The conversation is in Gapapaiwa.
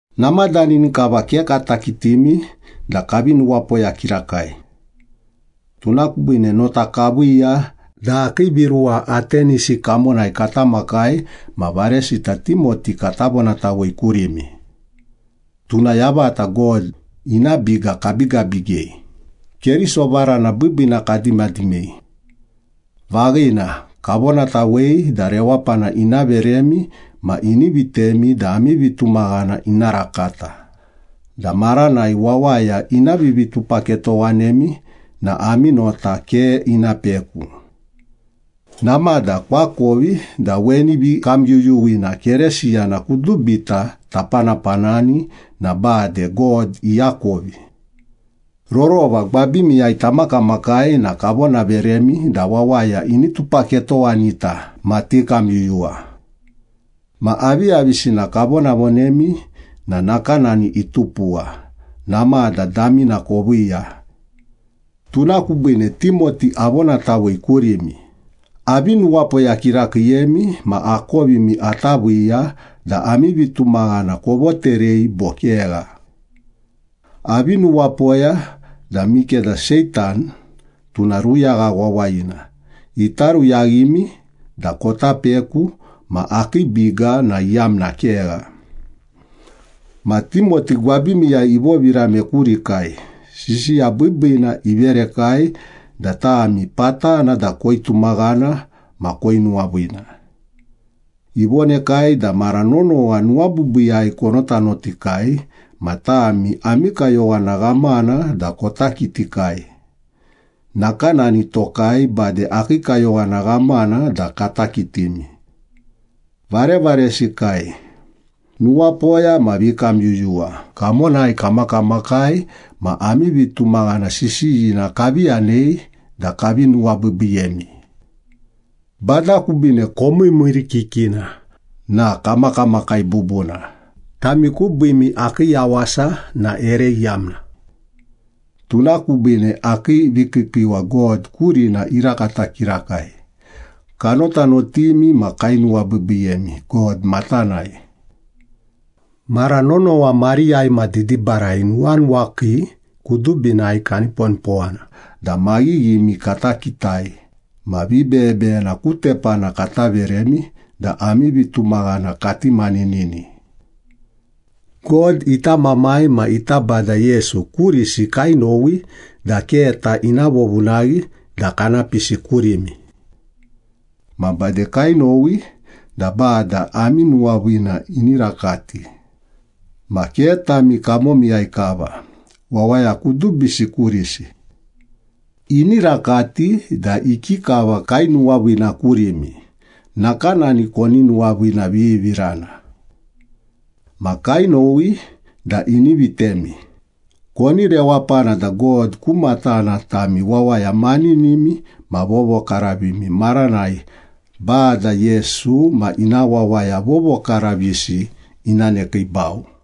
Namadani kava ke kata kitimi da kavi nuwapoya kirakai. Tuna kubiine nota kaviiya da akii viruwa Atenisi kamonai kata makai ma varesita Timoti kata vonatawei kurimi. Tuna yavata God ina biga kabigabigei, Keriso varana biibiina kadimadimei. Vaghina, kavonatawei da rewapana ina veremi ma ini vitemi da ami vitumaghana ina rakata, da maranai wawaya ina vivitupaketowanemi na ami nota ke ina peku. Namada koakovi da weni vikamyuyuwina Keresiyana kudubita tapanapanani na bade God iakovi. Rorova gwabimiyai tamakamakai na kavonaveremi da wawaya ini tupaketowanita ma tikamyuyuwa. Ma aviyavisina kavonavonemi na nakanani itupuwa, namada damina koviiya. Tuna kubiine Timoti avonatawei kurimi, avi nuwapoya kirakiiyemi ma akovimi ata viiya da ami vitumaghana kovoterei bo kegha. Avi nuwapoya da mikeda Seitan, tuna ruyagha wawayina, ita ruyaghimi da kota peku ma akii biga na iyamna kegha. Ma Timoti gwabimiyai ivovirame kurikai, sisiya biibiina iverekai da tami patana da koitumaghana ma koinuwaviina. Ivonekai da mara nonowa nuwabiibiiyai konotanotikai ma tami ami kayowana ghamana da kota kitikai nakanani tokai bade akii kayowana ghamana da kata kitimi. Varevaresikai, nuwapoya ma vikamyuyuwa kamonai kamakamakai ma ami vitumaghana sisiyina kavi yanei da kavi nuwabiibiiyemi. Bada kubiine komiirimiirikikina na kamakamakai bubuna, tami kubiimi akii yawasa na ere iyamna. Tuna kubiine akii vikiikiiwa God kurina irakata kirakai. Kanotanotimi ma kainuwabiibiiyemi God matanai. Mara nonowa mariyai ma didibarai nuwanuwakii kudubinai kaniponipowana da maghighimi kata kitai ma vibeyebeyena ku tepana kata veremi da ami vitumaghana kati maninini. God ita Mamai ma ita Bada Yesu kurisi kainowi da keta ina vovunaghi da kana pisi kurimi. Ma bade kainowi da Bada ami nuwaviina ini rakati, ma ke tami kamomiyai kava, wawaya kudubisi kurisi. Ini rakati da ikikava kainuwaviina kurimi, nakanani koni nuwaviinavivirana. Ma kainowi da ini vitemi, koni rewapana da God ku matana tami wawaya maninimi ma vovokaravimi maranai Bada Yesu ma ina wawaya vovokaravisi ina nekiibau.